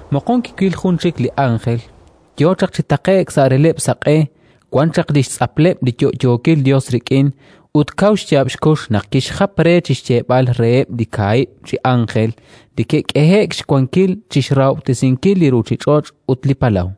Moqon kiwil jun chik li ánjel, yo chaq chi taqe'k sa' releb'l saq'e, wan chaq li xtz'apleb' li yo'yookil Yos rik'in. Ut kaw xyaab' xkux naq kixjap re chi xyeeb'al reheb' li kaahib' chi ánjel li ke'k'ehe'k xwankil chi xrahob'tesinkil li ruuchich'och' ut li palaw: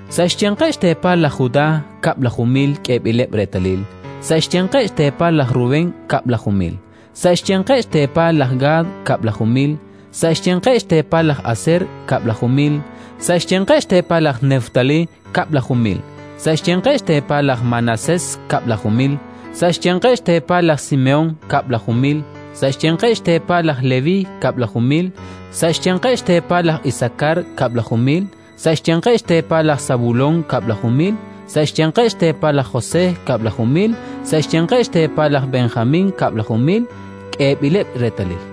Sa' xyanqeb' xteepal laj Judá kab'laju mil k'eeb'ileb' reetalil; sa' xyanqeb' xteepal laj Rubén kab'laju mil; sa' xyanqeb' xteepal laj Gad kab'laju mil; sa' xyanqeb' xteepal laj Aser kab'laju mil; sa' xyanqeb' xteepal laj Neftalí kab'laju mil; sa' xyanqeb' xteepal laj Manasés kab'laju mil; sa' xyanqeb' xteepal laj Simehón kab'laju mil; sa' xyanqeb' xteepal laj Leví kab'laju mil; sa' xyanqeb' xteepal laj Isakar kab'laju mil; sa' xyanqeb' xteepal laj Sabulón kab'laju mil; sa' xyanqeb' xteepal laj José kab'laju mil; sa' xyanqeb' xteepal laj Benjamín kab'laju mil k'eeb'ileb' reetalil.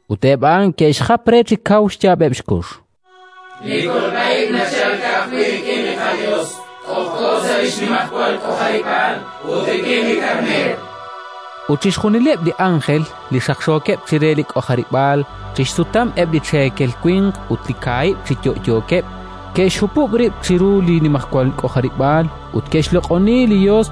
Ut eb' a'an ke'xjap re chi kaw xyaab'eb' xkux: “Li kolb'a ib' nachalk rik'in li qaYos k'ojk'o sa' li xnimajwal k'ojarib'aal, ut rik'in li Karneer”, chankeb'. Ut chixjunileb' li ánjel li xaqxookeb' chire li k'ojarib'aal, chi xsutam eb' li cheekel winq ut li kaahib' chi yo'yookeb', ke'xhupub' rib' chiru li nimajwal k'ojarib'aal ut ke'xloq'oni li Yos,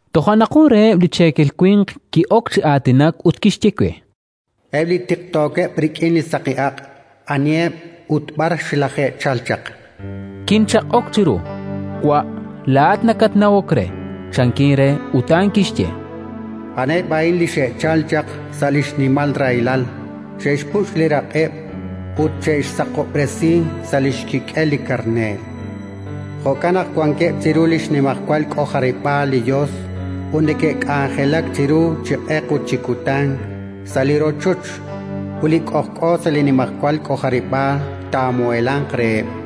Toja' naq jun reheb' li cheekel winq ki'ok chi aatinak ut kixye we: “Eb' li tiqtookeb' rik'in saqi aq', aniheb' ut b'ar xlaje'chalk chaq?” Kinchaq'ok chiru: “Wa', laa'at nakatnawok re”, chankin re. Ut a'an kixye: “A'aneb' a'in li xe'chalk chaq sa' li xnimal rahilal; xe'xpuch' li raq'eb' ut xe'xsaqob'resi sa' li xkik'el li Karneer. “Jo'kan naq wankeb' chiru li xnimajwal k'ojarib'aal li Yos ut neke'k'anjelak chiru chi q'eq ut chi kutan sa' li rochoch; ut li k'ojk'o sa' li nimajwal k'ojarib'aal taamuheelanq reheb'.